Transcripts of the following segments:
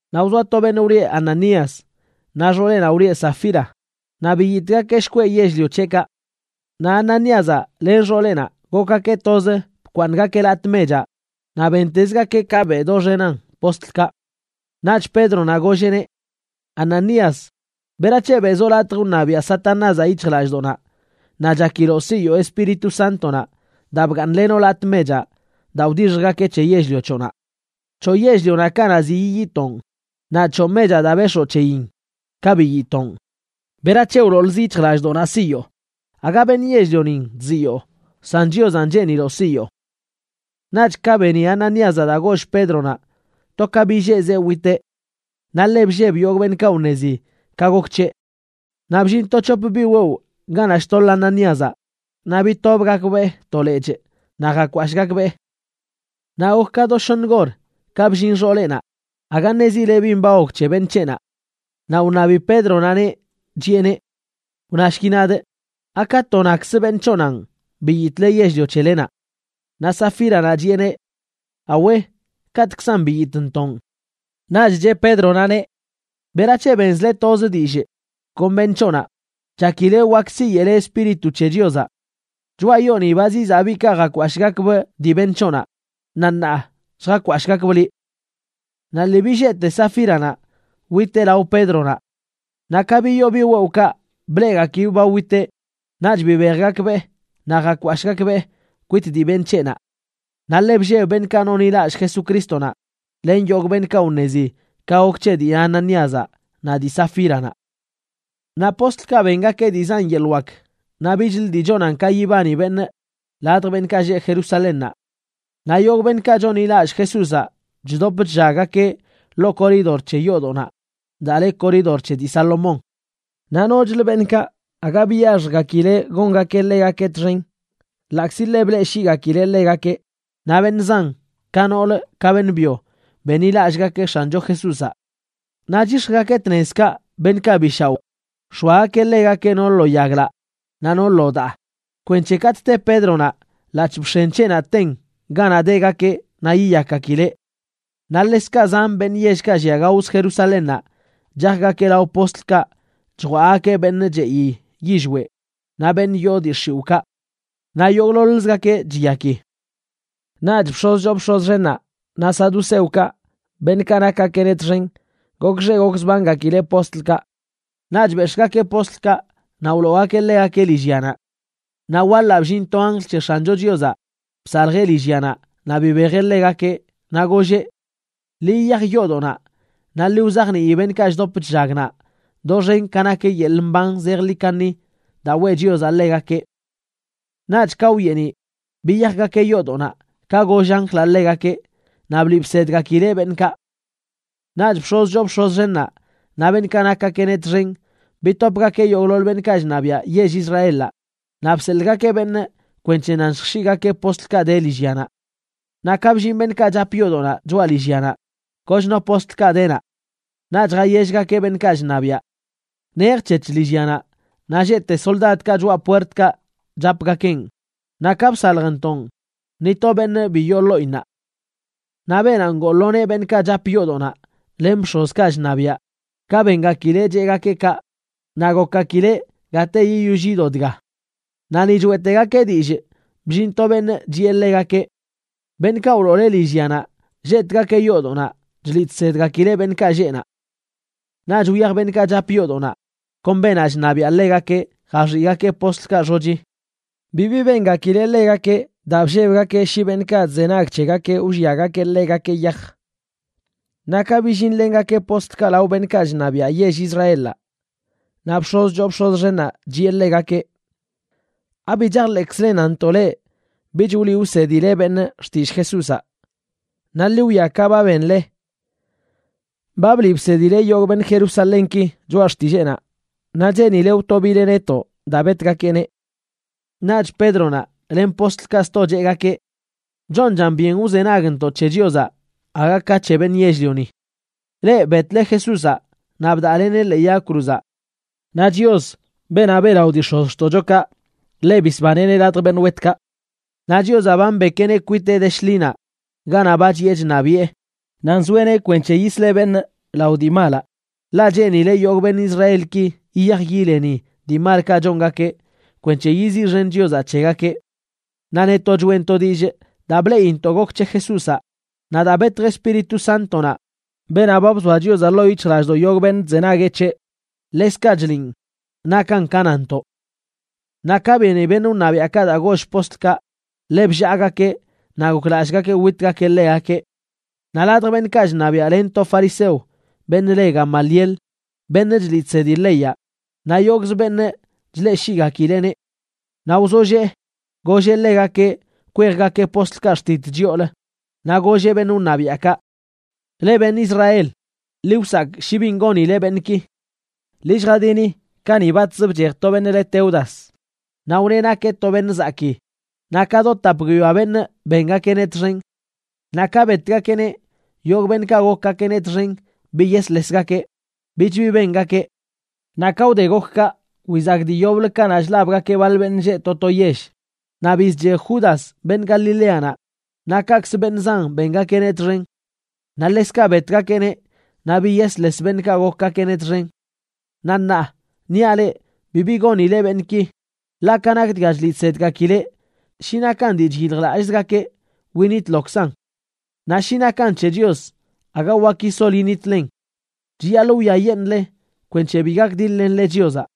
Naꞌ wzoa to beṉꞌ wlieꞌ Ananías, naꞌ xooleꞌnaꞌ wlieꞌ Safira, naꞌ biyitꞌgakeꞌ shkweꞌ yell-lio c̱heꞌkaꞌ. Naꞌ Ananíazaꞌ len xooleꞌnaꞌ gokgakeꞌ toz bkwaaṉgakeꞌ latꞌ mechaꞌ naꞌ bentezgakeꞌ ka beꞌ doxenan postlkaꞌ. Naꞌch Pédronaꞌ golleꞌneꞌ: ―Ananías, ¿berac̱he beꞌzoꞌ latj wṉabiaꞌ Satanázaꞌ yic̱hjlallꞌdoꞌnaꞌ naꞌ chakiloꞌ siyoo Espíritu Sántonaꞌ daa bgaaṉlenoꞌ latꞌ mechaꞌ daa wdixjgakeꞌ c̱he yell-lio c̱hoꞌnaꞌ? C̱hoꞌ yell-lionaꞌ kanaꞌ ziꞌ yiyitoon, naꞌ c̱hoꞌ mechaꞌ daa bex̱oo c̱heyin ka biyitoon. ¿Berac̱he wloolzə yic̱hjlallꞌdoꞌnaꞌ siyoo? Aga beṉꞌ yell-lionin chziyoo, san Chiozanꞌ cheeniloꞌ siyoo. Naꞌch ka beni Ananíazaꞌ daa goll Pédronaꞌ, to ka billeezeꞌ witeꞌ. Naꞌ ḻe blleb yogꞌ beṉꞌkaꞌ wṉezi ka gok c̱heꞌ. Naꞌ bllin to c̱hop biꞌ wewꞌ ganaꞌ chtoḻ Ananíazaꞌ, naꞌ bitobgakbee to lechꞌ naꞌ jakwashꞌgakbee. Naꞌ gok ka do shoṉ gor ka bllin xooleꞌnaꞌ, aga ṉezileꞌ bin ba gok c̱he beṉꞌ c̱heꞌnaꞌ. Naꞌ wṉabi Pédronaꞌneꞌ, chiꞌeneꞌ: ―Wnashki nadꞌ, ¿aka to nakz beṉꞌ c̱hoꞌnaꞌn biyitꞌle yell-lio c̱helenaꞌ? Naꞌ Safíranaꞌ chiꞌeneꞌ: ―Awe, kaꞌtꞌkzan biyitꞌntoꞌn. Naꞌch cheꞌ Pédronaꞌneꞌ: ―¿Berac̱he benzle toz dillꞌ kon beṉꞌ c̱hoꞌnaꞌ chakile wak siyeꞌle Espíritu c̱he Chiozaꞌ? Choꞌa yooni ba zizaꞌ biꞌkaꞌ jakwashꞌgakbꞌ dii beṉꞌ c̱hoꞌnaꞌ, naꞌ ṉaa lljakwashꞌgakbꞌ liꞌ. Naꞌ lii billeete Safíranaꞌ witeꞌ lao Pédronaꞌ. Naꞌ ka biyoo biꞌ wewꞌkaꞌ bleꞌgakibꞌ ba witeꞌ, naꞌch bibejgakbee naꞌ jakwashꞌgakbee kwit dii beṉꞌ c̱heꞌnaꞌ. Naꞌ ḻe blleb beṉꞌkaꞌ nonḻilallꞌ Jesucrístonaꞌ len yogꞌ beṉꞌkaꞌ wṉezi ka gok c̱he dii Ananíazaꞌ naꞌ dii Safíranaꞌ. Naꞌ postlkaꞌ bengakeꞌ dii zan yeḻꞌ wak naꞌ bichlə dii chonan ka yibani beṉꞌ ladj beṉꞌkaꞌ lleꞌ Jerusalénnaꞌ. Naꞌ yogꞌ beṉꞌkaꞌ chonḻilallꞌ Jesúzaꞌ chdop chllaggakeꞌ ḻoo koridor c̱he yoodoꞌnaꞌ daa le Koridor c̱he dii Salomón. Naꞌ nochlə beṉꞌkaꞌ aga biyaxjgakileꞌ gongakeꞌ ḻegakeꞌ txen, ḻaꞌkzi ḻe bleꞌshiigakileꞌ ḻegakeꞌ. Naꞌ beṉꞌ zan, ka noolə ka beṉꞌ byo, benḻilallꞌgakeꞌ X̱ancho Jesúzaꞌ. Naꞌ chyix̱jgakeꞌ tnezkaꞌ beṉꞌkaꞌ bi shaoꞌ, nx̱oagakeꞌ ḻegakeꞌ no lo yaglaꞌ naꞌ no lo daa, kwenc̱he katꞌ te Pédronaꞌ ḻaꞌc̱hꞌ bx̱en c̱heꞌnaꞌ ten ganaꞌ degakeꞌ naꞌ yiyakgakileꞌ. Naꞌ ḻekzkaꞌ zan beṉꞌ yellkaꞌ llia gaozə Jerusalénnaꞌ chajgakeꞌ lao postlkaꞌ chjwaꞌgakeꞌ beṉꞌ cheꞌi yillweꞌ naꞌ beṉꞌ yoo dii x̱iwꞌkaꞌ. Naꞌ yogꞌḻoḻzgakeꞌ chiyaki. Naꞌch bx̱oz choo bx̱oz xennaꞌ naꞌ saduceokaꞌ, beṉꞌkaꞌ nakgakeꞌneꞌ txen, gokxee gokzbangakileꞌ postlkaꞌ. Naꞌch bex̱ꞌgakeꞌ postlkaꞌ naꞌ wloogakeꞌ ḻegakeꞌ lillyanaꞌ. Naꞌ waḻaꞌ bllin to anjl c̱he X̱ancho Chiozaꞌ bsaljeꞌ lillyanaꞌ naꞌ bibejeꞌ ḻegakeꞌ, naꞌ golleꞌ: ―Ḻi yiyaj yoodoꞌnaꞌ, naꞌ ḻi wzajnii beṉꞌkaꞌ chdop chllag naꞌ doxen ka nak yeḻꞌ mban zejḻi kaṉi daa weꞌ Chiozaꞌ ḻegakeꞌ. Naꞌch ka wyeeniꞌ, biyajgakeꞌ yoodoꞌnaꞌ ka goll anjlaꞌ ḻegakeꞌ, naꞌ bliꞌ bsedgakileꞌ beṉꞌkaꞌ. Naꞌch bx̱oz choo bx̱oz xennaꞌ naꞌ beṉꞌkaꞌ nakgakeꞌneꞌ txen bitopgakeꞌ yogꞌḻoḻ beṉꞌkaꞌ chṉabiaꞌ yell Israelaꞌ, naꞌ bseḻꞌgakeꞌ beṉꞌ kwenc̱he nan lljx̱iꞌgakeꞌ postlkaꞌ de lillyanaꞌ. Naꞌ ka bllin beṉꞌkaꞌ chap yoodoꞌnaꞌ choꞌa lillyanaꞌ, kochno postlkaꞌ de naꞌ. Naꞌch jayellgakeꞌ beṉꞌkaꞌ chṉabiaꞌ: ―Nejc̱hec̱h lillyanaꞌ, naꞌ lleꞌte soldadkaꞌ choꞌa puertkaꞌ chapgakeꞌn, naꞌ ka bsaljntoꞌn, ni to beṉꞌ bi yoo ḻoꞌinnaꞌ. Naꞌ beenaꞌ ngoo lo nee beṉꞌkaꞌ chap yoodoꞌnaꞌ, len bx̱ozkaꞌ chṉabiaꞌ, ka bengakileꞌ cheꞌgakeꞌ kaꞌ, naꞌ gokgakileꞌ gate yiyoll yido dga. Naꞌ ni choeꞌtegakeꞌ dillꞌ, bllin to beṉꞌ chiꞌe ḻegakeꞌ: ―Beṉꞌkaꞌ wloole lillyanaꞌ lleꞌtgakeꞌ yoodoꞌnaꞌ chliꞌ chsedgakileꞌ beṉꞌkaꞌ lleꞌ naꞌ. Naꞌch wyaj beṉꞌkaꞌ chap yoodoꞌnaꞌ kon beenaꞌ chṉabiaꞌ ḻegakeꞌ jaxiꞌgakeꞌ postlkaꞌ xochi. Bibi bengakileꞌ ḻegakeꞌ daa bllebgakeꞌ shi beṉꞌkaꞌ chzenag c̱hegakeꞌ wlliagakeꞌ ḻegakeꞌ yaj. Naꞌ ka billinlengakeꞌ postlkaꞌ lao beṉꞌkaꞌ chṉabiaꞌ yell Israelaꞌ, naꞌ bx̱oz choo bx̱oz xennaꞌ chiꞌe ḻegakeꞌ: ―¿Abi chajḻeꞌkzlen nantoꞌ leꞌ bich wliꞌ wsedzile beṉꞌ xtillꞌ Jesúzaꞌ? Naꞌ ḻi wwia ka ba benle, ba bliꞌ bsedile yogꞌ beṉꞌ Jerusalénki choꞌa xtilleenaꞌ, naꞌ cheenile wtobile netoꞌ daa betgakeꞌneꞌ. Naꞌch Pédronaꞌ len postlkaꞌ sto cheꞌgakeꞌ: ―Chonchan byen wzenagntoꞌ c̱he Chiozaꞌ aga ka c̱he beṉꞌ yell-lioni. Leꞌ betle Jesúzaꞌ naꞌ bdaꞌleneꞌ ḻee yag cruzaꞌ. Naꞌ Chios, beenaꞌ beꞌlaꞌo dii x̱ozxtoꞌchokaꞌ, ḻeꞌ bisbaneꞌneꞌ ladj beṉꞌ wetkaꞌ. Naꞌ Chiozaꞌ ba mbekeꞌneꞌ kwiteꞌ de shḻinaꞌ ganaꞌ ba chiꞌe chṉabiꞌe, naꞌ nzoeꞌneꞌ kwenc̱he yisleꞌ beṉꞌ lao dii malaꞌ, ḻaꞌ cheenileꞌ yogꞌ beṉꞌ Israelki yiyaj yileni dii malkaꞌ chongakeꞌ kwenc̱he yiziꞌxen Chiozaꞌ c̱hegakeꞌ. Naꞌ netoꞌ choeꞌntoꞌ dillꞌ daa bleꞌintoꞌ gok c̱he Jesúzaꞌ, naꞌ daa betj Espíritu Sántonaꞌ, beenaꞌ ba bzoa Chiozaꞌ ḻoo yic̱hjlallꞌdoꞌ yogꞌ beṉꞌ chzenagueꞌ c̱heꞌ, ḻekzkaꞌ chliꞌn nakan ka nanntoꞌ. Naꞌ ka beni beṉꞌ wṉabiaꞌkaꞌ daa goll postlkaꞌ, ḻe bllaagakeꞌ naꞌ goklallꞌgakeꞌ witgakeꞌ ḻegakeꞌ. Naꞌ ladj beṉꞌkaꞌ chṉabiaꞌ len to fariseo, beṉꞌ le Gamaliel, beṉꞌ chliꞌ chsedi leyaꞌ, naꞌ yogꞌz beṉꞌ chleꞌshiꞌgakileꞌneꞌ. Naꞌ wzollee, golleꞌ ḻegakeꞌ kwejgakeꞌ postlkaꞌ xtit chyoolə, naꞌ golleꞌ beṉꞌ wṉabiaꞌkaꞌ: ―Leꞌ, beṉꞌ Israel, ḻi wsakꞌ shi bin gonile beṉꞌki. Ḻi lljadini kani batz bchej to beṉꞌ le Teudas, naꞌ wneꞌ nakeꞌ to beṉꞌ zakii, naꞌ ka do tap guiyoa beṉꞌ bengakeꞌneꞌ txen. Naꞌ ka betgakeꞌneꞌ, yogꞌ beṉꞌkaꞌ gokgakeꞌneꞌ txen biyesḻesgakeꞌ, bich bi bengakeꞌ. Naꞌ ka wde gok kaꞌ, wizak dii yoblə kanaꞌ chlabgakeꞌ baḻ beṉꞌ lleꞌ to to yell, naꞌ bizchej Judas beṉꞌ Galileanaꞌ, naꞌ kaꞌkzə beṉꞌ zan bengakeꞌneꞌ txen. Naꞌ ḻekzkaꞌ betgakeꞌneꞌ naꞌ biyesḻes beṉꞌkaꞌ gokgakeꞌneꞌ txen. Naꞌ ṉaa, niaꞌ leꞌ bibi gonile beṉꞌki, ḻaꞌ ka nak dga chliꞌ chsedgakileꞌ, shi nakan dii chyiljlallꞌzgakeꞌ winitlokzan. Naꞌ shi nakan c̱he Chios, aga wak yisol yiṉitlen. Chiyaḻꞌ wwiayeṉꞌle kwenc̱he bi gakdiḻ-lenle Chiozaꞌ.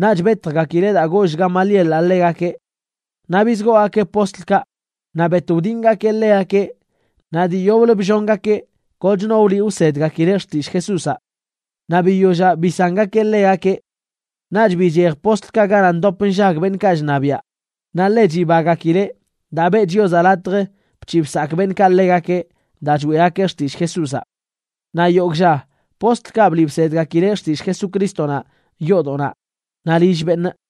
Naꞌch betjgakileꞌ daa goll Gamalielaꞌ ḻegakeꞌ. Naꞌ bizgoogakeꞌ postlkaꞌ, naꞌ bet wdingakeꞌ ḻegakeꞌ, naꞌ dii yoblə bllongakeꞌ kochno wliꞌ wsedgakileꞌ xtillꞌ Jesúzaꞌ. Naꞌ biyollaꞌ bisangakeꞌ ḻegakeꞌ. Naꞌch bichej postlkaꞌ ganaꞌ ndop nllag beṉꞌkaꞌ chṉabiaꞌ, naꞌ ḻe chibagakileꞌ daa beꞌ Chiozaꞌ latj bc̱hiꞌ bsakꞌ beṉꞌkaꞌ ḻegakeꞌ daa choeꞌgakeꞌ xtillꞌ Jesúzaꞌ. Naꞌ yogꞌ lla postlkaꞌ bliꞌ bsedgakileꞌ xtillꞌ Jesucrístonaꞌ yoodoꞌnaꞌ naꞌ lill beṉꞌ.